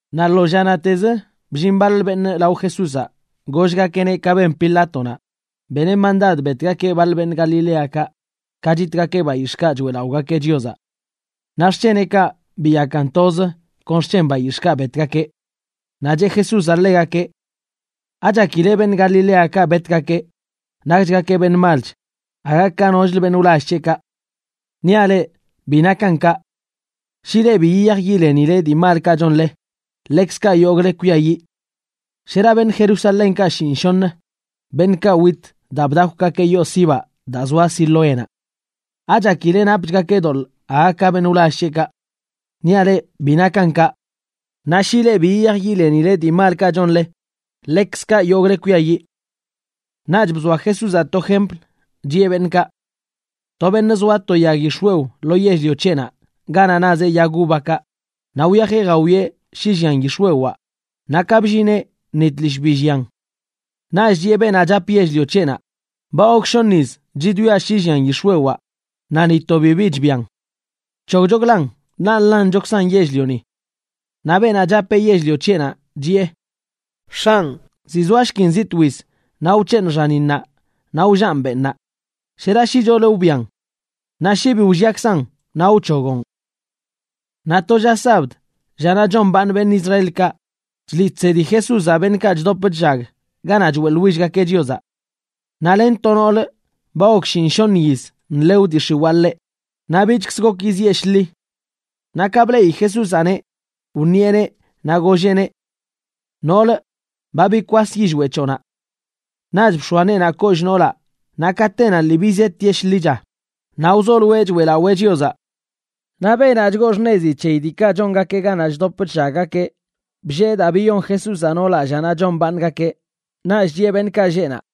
Naꞌ lo llanaꞌtezə bllin baḻ beṉꞌ lao Jesúzaꞌ gollgakeꞌneꞌ ka ben Pilátonaꞌ beneꞌ mandad betgakeꞌ baḻ beṉꞌ Galiléakaꞌ ka chitgakeꞌ bayix̱ꞌkaꞌ choeꞌlaꞌogakeꞌ Chiozaꞌ. Naꞌ xc̱heneꞌkaꞌ biyakan toz kon xc̱hen bayix̱ꞌkaꞌ betgakeꞌ. Naꞌ cheꞌ Jesúzaꞌ ḻegakeꞌ: ―¿Achakile beṉꞌ Galiléakaꞌ betgakeꞌ nakchgakeꞌ beṉꞌ malch aga ka nochlə beṉꞌ wlall c̱heꞌkaꞌ? Niaꞌ leꞌ bi nakan kaꞌ. Shi leꞌ bi yiyaj yilenile dii malkaꞌ chonle, ḻekzkaꞌ yogꞌle kwiayiꞌ. Shera beṉꞌ Jerusalénkaꞌ shiṉꞌshoṉə, beṉꞌkaꞌ wit daa bdakwgakeꞌ yoo sibaꞌ daa zoa Siloénaꞌ, ¿achakileꞌ napchgakeꞌ doḻꞌ aga ka beṉꞌ wlall c̱heꞌkaꞌ? Niaꞌ leꞌ bi nakan kaꞌ. Naꞌ shi leꞌ bi yiyaj yilenile dii malkaꞌ chonle, ḻekzkaꞌ yogꞌle kwiayiꞌ. Naꞌch bzoa Jesúzaꞌ to jempl, chiꞌe beṉꞌkaꞌ: ―To beṉꞌ zoa to yag yix̱wew lo yell-lio c̱heꞌnaꞌ ganaꞌ nazeꞌ yag uvakaꞌ, naꞌ wyajeꞌ jawieꞌ shi llian yix̱wewaꞌ, naꞌ ka bllineꞌ ni tlishꞌ bi llian. Naꞌch chiꞌe beenaꞌ chap yell-lio c̱heꞌnaꞌ: “Ba gok shoṉ yiz chidwiaꞌ shi llian yix̱wewaꞌ, naꞌ ni to bibi chbian. Bc̱hogchoklan, ḻaꞌ nḻanchokzan yell-lioni.” Naꞌ beenaꞌ chapeꞌ yell-lio c̱heꞌnaꞌ chiꞌe: “X̱anꞌ, ziꞌ zoashkin zi twiz naꞌ wc̱heeṉꞌ xaninnaꞌ naꞌ wllaꞌn benꞌnaꞌ. Shera shicholə wbian. Naꞌ shi bi wlliakzan, naꞌ wc̱hogoꞌn.” Naꞌ to lla sabd, llanaꞌ chombaaṉ beṉꞌ Israelkaꞌ, chliꞌ chsedi Jesúzaꞌ beṉꞌkaꞌ chdop chllag ganaꞌ choeꞌḻwillgakeꞌ Chiozaꞌ. Naꞌ len to noolə ba gok shiṉꞌshoṉ yiz nḻew dii x̱iwaa ḻeꞌ, naꞌ bichkzə gok yizieꞌ shḻi. Naꞌ ka bleꞌi Jesúzaꞌneꞌ wṉieꞌneꞌ naꞌ golleꞌneꞌ: ―Noolə, ba bikwas yillweꞌ c̱hoꞌnaꞌ. Naꞌch bx̱oa neenaꞌ kollꞌ noolaꞌ naꞌ katenaꞌ lii bizetieꞌ shḻicha, naꞌ wzoloeꞌ choeꞌlawee Chiozaꞌ. Naꞌ beenaꞌ chgoo xṉezi c̱heyi diikaꞌ chongakeꞌ ganaꞌ chdop chllaggakeꞌ bllee daa biyon Jesúzaꞌ noolaꞌ llanaꞌ chombaaṉgakeꞌ, naꞌch chiꞌe beṉꞌkaꞌ lleꞌ naꞌ: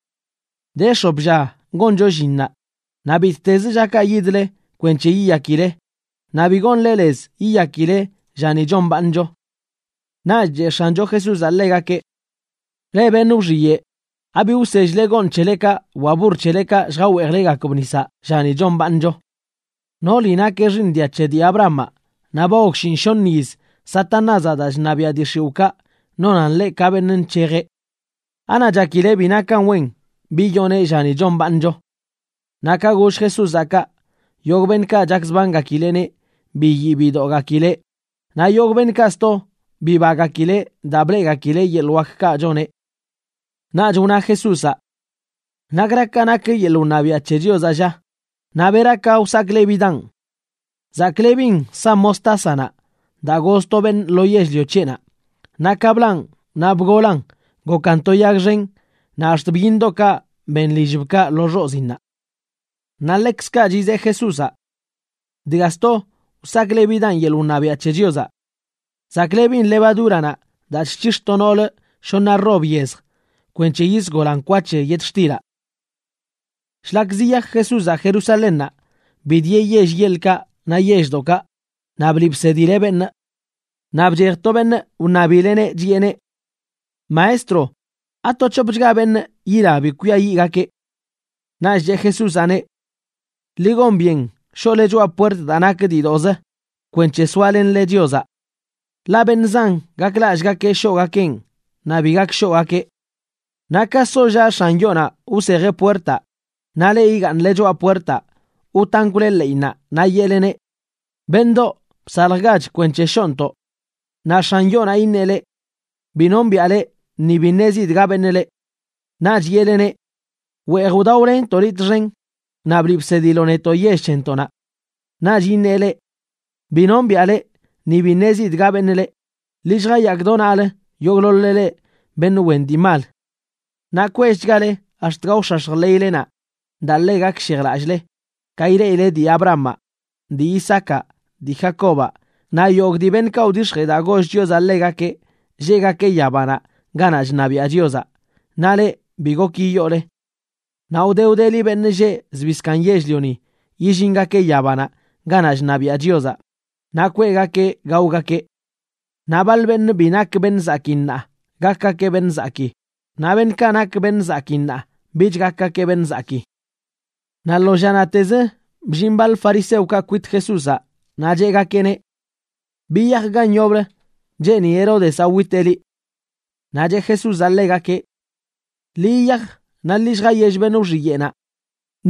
―De x̱op lla goncho llinnaꞌ, naꞌ bittezə llakaꞌ yidle kwenc̱he yiyakile, naꞌ bi gonle lez yiyakileꞌ llani chombaaṉcho. Naꞌch cheꞌ X̱ancho Jesúzaꞌ ḻegakeꞌ: ―Leꞌ beṉꞌ wxiyeꞌ, ¿abi wsell-le gooṉ c̱helekaꞌ wa burr c̱helekaꞌ lljaweejlegakb nisaꞌ llani chombaaṉcho? Nooli nakeꞌ xiiṉ dia c̱he dii Abrahamaꞌ, naꞌ ba gok shiṉꞌshoṉ yiz Satanázaꞌ daa chṉabiaꞌ dii x̱iwꞌkaꞌ nonan ḻeꞌ ka beṉꞌ nc̱hejeꞌ. ¿Anaꞌ chakile bi nakan wen biyonee llani chombaaṉcho? Naꞌ ka goll Jesúzaꞌ kaꞌ, yogꞌ beṉꞌkaꞌ chakzbangakileꞌneꞌ biyii bidoꞌgakileꞌ, naꞌ yogꞌ beṉꞌkaꞌ sto bibagakileꞌ daa bleꞌgakileꞌ yeḻꞌ wakkaꞌ choneꞌ. Naꞌch wna Jesúzaꞌ: ―¿Nakra ka nak yeḻꞌ wṉabiaꞌ c̱he Chiozaꞌ, lla? Naꞌ ¿bera ka wsaklebidaꞌn? Zaklebin sa mostásanaꞌ daa goz to beṉꞌ lo yell-lio c̱heꞌnaꞌ, naꞌ ka blaꞌn naꞌ bgolan gokan to yag xen naꞌ ax̱t byiṉdoꞌkaꞌ ben lillbkaꞌ lo xoziinnaꞌ. Naꞌ ḻekzkaꞌ chizeꞌ Jesúzaꞌ: ―Dga sto wsaklebidaꞌn yeḻꞌ wṉabiaꞌ c̱he Chiozaꞌ. Zaklebin levadúranaꞌ daa chc̱hix̱ to noolə shoṉa rob yezj kwenc̱he yisgolan kwa c̱he yetxtilaꞌ. Shlak ziyaj Jesúzaꞌ Jerusalénnaꞌ, bidieꞌ yell yeḻkaꞌ naꞌ yelldoꞌkaꞌ naꞌ bliꞌ bsedileꞌ beṉꞌ. Naꞌ bchej to beṉꞌ wṉabileꞌneꞌ, chiꞌeneꞌ: ―Maestro, ¿ato c̱hopchga beṉꞌ yila bi kwiayiꞌgakeꞌ? Naꞌch cheꞌ Jesúzaꞌneꞌ: ―Ḻi gon byen shoꞌle choꞌa puert daa nak diidoꞌzə kwenc̱he soalenle Chiozaꞌ. Ḻaꞌ beṉꞌ zan gaklallꞌgakeꞌ shoꞌgakeꞌn, naꞌ bi gak shoꞌgakeꞌ. Naꞌ ka sollaꞌ x̱an yoonaꞌ wsejeꞌ puertaꞌ, naꞌ leꞌ, igaaṉle choꞌa puertaꞌ wtankwle ḻeꞌinnaꞌ naꞌ yeꞌleneꞌ: “Beṉꞌdoꞌ, bsaljgach kwenc̱he shoꞌntoꞌ.” Naꞌ x̱an yoonaꞌ iṉeꞌ leꞌ: “Bi nombiꞌa leꞌ ni bi ṉezidꞌ ga beṉꞌ leꞌ.” Naꞌch yeꞌleneꞌ: “Weej wdaolenntoꞌ liꞌ txen, naꞌ bliꞌ bsediloꞌ netoꞌ yell c̱hentoꞌnaꞌ.” Naꞌch iṉeꞌ leꞌ: “Bi nombiꞌa leꞌ, ni bi ṉezidꞌ ga beṉꞌ leꞌ. Ḻi lljayaak do naꞌlə yogꞌḻoḻ-le leꞌ beṉꞌ wen dii mal.” Naꞌ kwellchgale ax̱t gaox̱ax̱j ḻeylenaꞌ daa ḻe gakshejlallꞌle ka ileꞌile dii Abrahamaꞌ, dii Isaacaꞌ, dii Jacobaꞌ naꞌ yogꞌ dii beṉꞌkaꞌ wdix̱jee daa goll Chiozaꞌ ḻegakeꞌ lleꞌgakeꞌ yabanaꞌ ganaꞌ chṉabiaꞌ Chiozaꞌ, naꞌ leꞌ, bi gok yiyoole. Naꞌ wde wdeli beṉꞌ lleꞌ zbii zkaaṉ yell-lioni yillingakeꞌ yabanaꞌ ganaꞌ chṉabiaꞌ Chiozaꞌ naꞌ kweꞌgakeꞌ gaogakeꞌ. Naꞌ baḻ beṉꞌ bi nak beṉꞌ zakii ṉaa gakgakeꞌ beṉꞌ zakii, naꞌ beṉꞌkaꞌ nak beṉꞌ zakii ṉaa bich gakgakeꞌ beṉꞌ zakii. Naꞌ lo llanaꞌtezə bllin baḻ fariseokaꞌ kwit Jesúzaꞌ naꞌ cheꞌgakeꞌneꞌ: ―Biyaj gan yoblə. Cheeni Heródezaꞌ witeꞌ liꞌ. Naꞌ cheꞌ Jesúzaꞌ ḻegakeꞌ: ―Ḻi yiyaj naꞌ ḻi lljayell beṉꞌ wxiyeꞌnaꞌ: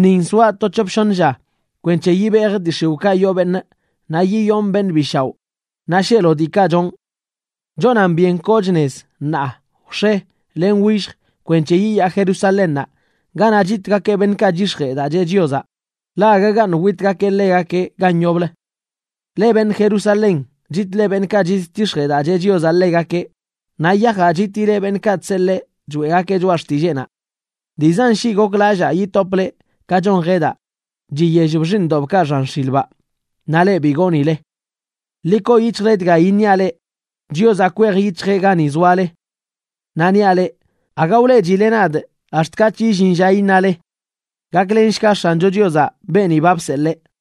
“Nin soaꞌ to c̱hop shoṉ lla kwenc̱he yibejꞌ dii x̱iwꞌkaꞌ yoo beṉꞌ naꞌ yiyonꞌ beṉꞌ bi shaoꞌ, naꞌ sheelo diikaꞌ chonꞌ.” Chonan byen koochꞌ nez ṉaa, wx̱e len willj kwenc̱he yiyaa Jerusalénnaꞌ ganaꞌ chitgakeꞌ beṉꞌkaꞌ chyix̱jee daa cheꞌ Chiozaꞌ, ḻaꞌ agagaṉꞌ witgakeꞌ ḻegakeꞌ gan yoblə. ’¡Leꞌ beṉꞌ Jerusalén, chitle beṉꞌkaꞌ chidtix̱jee daa cheꞌ Chiozaꞌ ḻegakeꞌ, naꞌ yajaꞌ chitile beṉꞌkaꞌ chseḻee choeꞌgakeꞌ choꞌa xtilleenaꞌ! Dii zan shii goklallaa yitopꞌ leꞌ ka chon jedaꞌ chiyellb xiiṉdobkaꞌ xan x̱ilbaꞌ, naꞌ leꞌ bi goonileꞌ. Ḻi koo yic̱hjle dga iṉiaꞌ leꞌ, Chiozaꞌ kwej yic̱hjeꞌ gani zoale. Naꞌ niaꞌ leꞌ, aga wleꞌchile nadꞌ ax̱t katꞌch illin lla iṉale: “¡Gaklenshga X̱ancho Chiozaꞌ beeni ba bseḻee!”